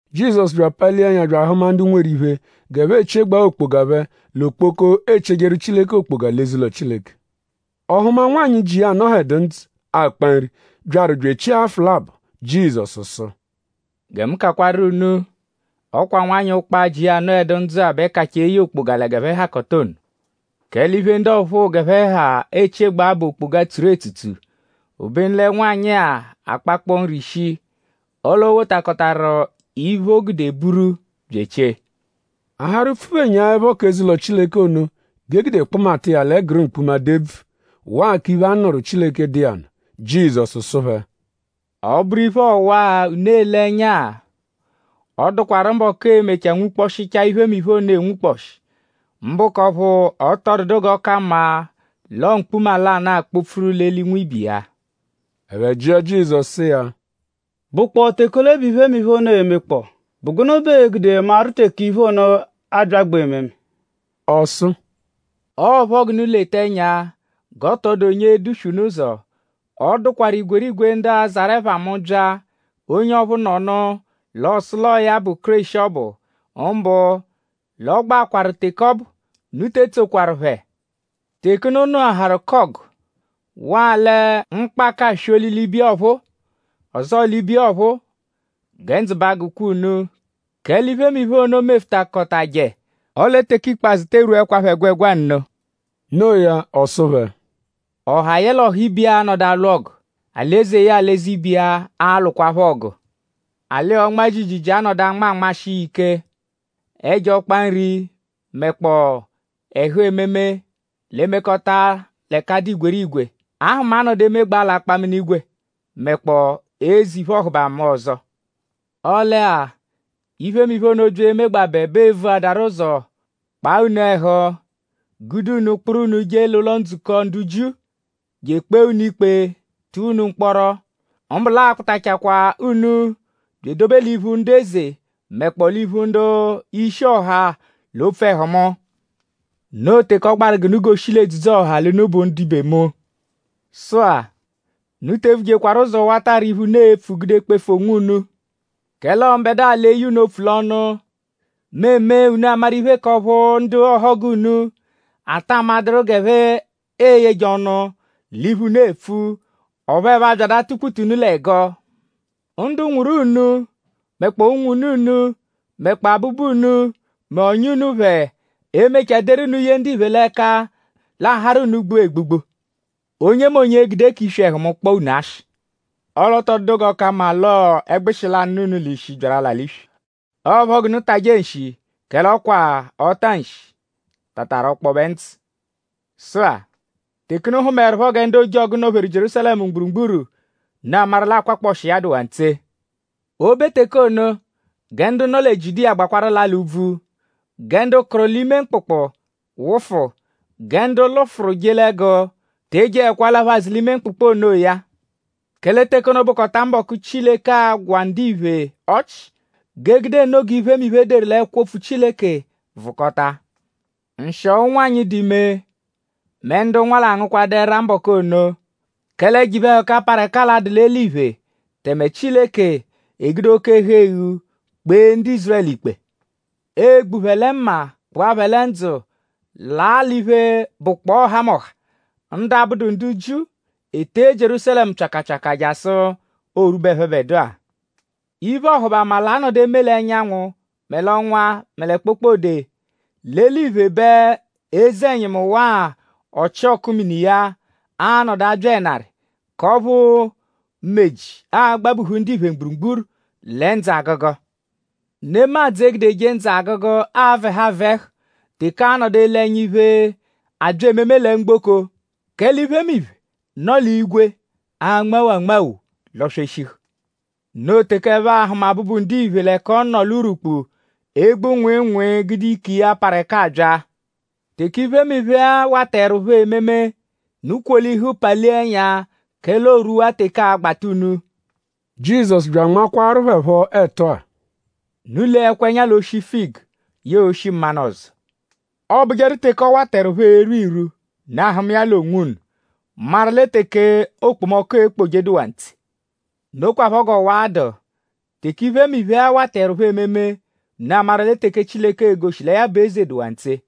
Jizọsu bya apalia ẹnya bya ahụma ndu nweru iphe g'ẹphe echiegbaa okpoga phẹ l'okpoko, eechiejeru Chileke okpoga l'eze-ụlo Chileke. Ọ hụma nwanyị, ji iya anọhedu ndzụ, akpa nri, byaru bya echie afụ labọ. Jizọsu sụ: “Gẹ mu kakwaru unu; ọ kwa nwanyị ụkpa-a, ji iya anọedu ndzụ-a bẹ kachaa eye okpoga lẹ g'ẹphe hakọta ono. Kẹle iphe, ndu ọphuu g'ẹphe ha echiegbaa bụ okpoga, tsuru etsutsu; obenu lẹ nwanyị-a akpakpọ nri shii; ọle o wotakọtaru iphe, o gude buru bya echie.” A harụ pfuphenyaẹpho k'eze-ụlo Chileke ono g'e gude kpụmata iya l'ẹguru mkpuma, dụ ebvu; waa k'iphe, a nụru Chileke, dụ iya nụ; Jizọsu sụ phẹ: “Ọ -bụru iphe ọwa-a, unu ele ẹnya-a; ọ dụkwaru mbọku, ee-mechaa nwukpọshichaa iphemiphe ono enwukpọshi; mbụ k'ọphu ọ tọ dụdu g'ọ ka mma l'ọo mkpuma lanụ, akpọ-pfuru l'eli nwibe iya.” Ẹphe jịa Jizọsu sụ iya: “?Bụkpoo teke ole bẹ iphemiphe ono e-mekpọo??Bụ gụnu bẹ ee-gude maru teke iphe ono abyagbaa ememe?” Ọ sụ: “Ọo phọ g'unu leta ẹnya g'ọ tọ dụ onye e-duswe unu ụzo. Ọ dụkwaru igwerigwe ndu a-zarụ ẹpha mu bya. Onye ọphu nọnu l'ọ sụ l'ọo ya bụ Kéreshi ọbu; mbụ l'ọogbaakwa teke ọbu. Unu te etsokwaru phẹ. Teke unu nụaharu k'ọgu; waa lẹ mkpaka aswoli l'ibiya ọphuu; ọzoo l'ibiya ọphuu; gẹ ndzụ ba agụkwa unu; kẹle iphemiphe ono mefutakọtaje; ọle teke ikpazụ tee rwuẹkwapho ẹgwegwa nno.” No iya; ọ sụ phẹ: “Ọha yẹle ọha ibe iya a-nọdu alwụ ọgu; alị-eze yẹe alị-eze ibe iya a-lwụkwapho ọgu. Alị-ọnma-jiijiijii a-nọdu anma anmashị iya ike; ẹjo ọkpa-nri mẹkpoo ẹhu, eme ememe l'e-mekọta l'ẹka dụ igwerigwe. Ahụma a-nọdu emegbaa l'akpaminigwe mẹkpoo eze iphe-ọhubama ọzo. “Ọle-a; iphemiphe ono -bya emegbabẹ bẹ ee-vuadaru ụzo kpaa unu ẹhu; gude unu; kpụru unu je l'ụlo-ndzukọ ndu Jiu je ekpee unu ikpe; tụa unu mkpọro; mbụ l'aa-kpụtachakwaa unu bya edobe l'iphu ndu eze; mẹkpoo l'iphu ndu-ishi ọha l'opfu ẹhu mu. Noo teke ọ gbaru g'unu goshi l'edzudzu-ọha l'unu bụ ndibe mu. Sụ-a; unu te evujekwaru ụzo wata arị iphe, unu e-pfu gude kpefu onwunu; kẹle ọo mbẹdua l'e-ye unu opfu l'ọnu. Mu e-me unu amaru iphe k'ọphu ndu ọhogu unu a-ta amadụru g'ẹphe e-yeje ọnu l'iphe, unu epfu; ọphu ẹphe a-byadu atụ-kpute unu l'ẹgo. Ndu nwụru unu; mẹkpoo unwune unu; mẹkpoo abụbu unu; mẹ ọ̀nyà unu phẹ e-mechaa deru unu ye ndiphe l'ẹka; l'a harụ unu gbua egbugbu. Onyemonye e-gude k'iswi ẹhu mu kpọo unu ashị. Ọle ọ tọ dụdu g'ọ ka mma l'ọo ẹgbushi lanụ, nọ unu l'ishi, byaru l'ala l'iswi. Ọo ẹpho g'unu tajẹ nshi; kẹle ọ kwa ọ-ta-nshi tataru ọkpobe ndzụ.” “Sụ-a; teke unu hụmaerupho gẹ ndu ojọgu nọ-pheru Jierúsalẹmu mgburugburu; unu amaru l'akwakpọshi iya dụwaa ntse. O -be teke ono; gẹ ndu nọ lẹ Jiudiya gbalakwaa laa l'úbvú; gẹ ndu kụru l'ime mkpụkpu wụfu; gẹ ndu lụfuru je l'ẹgu te jeẹkwa alaphu azụ l'ime mkpụkpu onoya. Kẹle teke ono bụkota mbọku, Chileke a-gwa ndiphe ọchi g'e gude nno g'iphemiphe, e deru l'ẹkwo Opfu Chileke vụkota. Nshịo ụnwanyi, dụ ime; mẹ ndu nwa l'angụkwadu ẹra mbọku ono. Kẹle ẹjo iphe-ẹhuka, parụ ẹka a-dụ l'eliphe; tẹme Chileke e-gude oke-ẹhu-eghu kpee ndu Ízurẹlu ikpe. Ee-gbu phẹ lẹ mma; kpụa phẹ lẹ ndzụ laa l'iphe, bụkpoo ọhamoha. Ndu abụdu ndu Jiu e-tee Jierúsalẹmu pyakapyaka jasụ oo-rwube ẹphebedua.” “Iphe-ọhubama l'a-nọdu eme l'ẹnyanwu; mẹ l'ọnwa; mẹ lẹ kpokpode. L'eliphe bẹ eze-ẹnyimu waa ọchioku mini iya a-nọdu abya ẹnari; k'ọphu meji a-gbabuhu ndiphe mgburugburu lẹ ndzụ-agụgu. Nemadzụ e-gudeje ndzụ-agụgu avẹhu avẹhu teke aa-nọdu ele ẹnya iphe, abya ememe lẹ mgboko; kẹle iphemiphe, nọ l'igwe a-nmawo anmawo; lọ-sweshihu. Noo teke ẹphe a-hụma Abụbu-Ndiphe l'ẹka ọ nọ l'urwukpu; egbu nwịinwii gude ike iya, parụ ẹka abya. Teke iphemiphe-a wataẹrupho ememe; unu kwolihu; palia ẹnya; kẹle oorwuwaa teke aa-gbata unu.” Jizọsu bya anmakwaaru phẹ phọ ẹtu-a: “Unu leẹkwa ẹnya l'oshi figu yẹe oshi mmanụ ọzo. Ọobujeru teke ọ wataẹrupho erwu irwu; unu ahụma iya l'onwunu; maru lẹ teke okpomọku ekpoje dụwaa ntse. Nokwaphọ g'ọwa-a dụ. Teke iphemiphe-a wataẹrupho ememe; unu amaru lẹ teke Chileke e-goshi lẹ ya bụ eze dụwaa ntse.”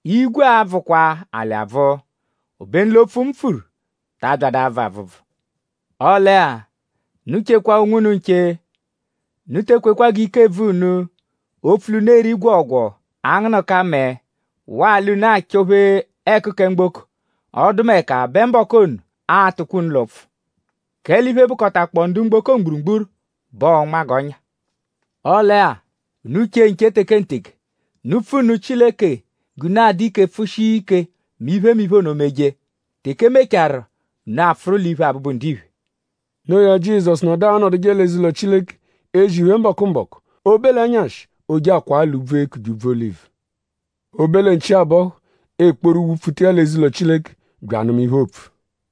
Igwe a-bvụkwa alị abvụ; obenu l'opfu, mu pfuru ta abyadụ abvụ abvụbvu. “Ọle-a; unu chekwa onwunu nche. Unu te ekwekwa g'ike bvụ unu; opfu l'unu eri gwọogwoo; angụnuka mẹe; waa l'unu achọ-phe ẹku kẹ mgboko; ọdumeka bẹ mbọku ono a-tụkwa unu l'ụpfu. Kẹle iphe, bụkotakpoo ndu mgboko mgburugburu bẹ ọo-nma g'ọ́nyà. Ọle-a; unu che nche tekenteke; unu pfu nụ Chileke g'unu a-dụ ike pfụ-shia ike mẹ iphemiphe ono -meje. Teke e mecharu unu apfụru l'iphu Abụbu-Ndiphe.” Noo ya; Jizọsu nọdu anọduje l'eze-ụlo Chileke; ezi iphe mbọku-mbọku; o -be l'ẹnyashi ooje akwaa l'úbvú, eekuje Úbvú-Olivu. O -be lẹ nchi abọhu; e kporu wụ-pfuta iya l'eze-ụlo Chileke bya anụma iphe, oopfu.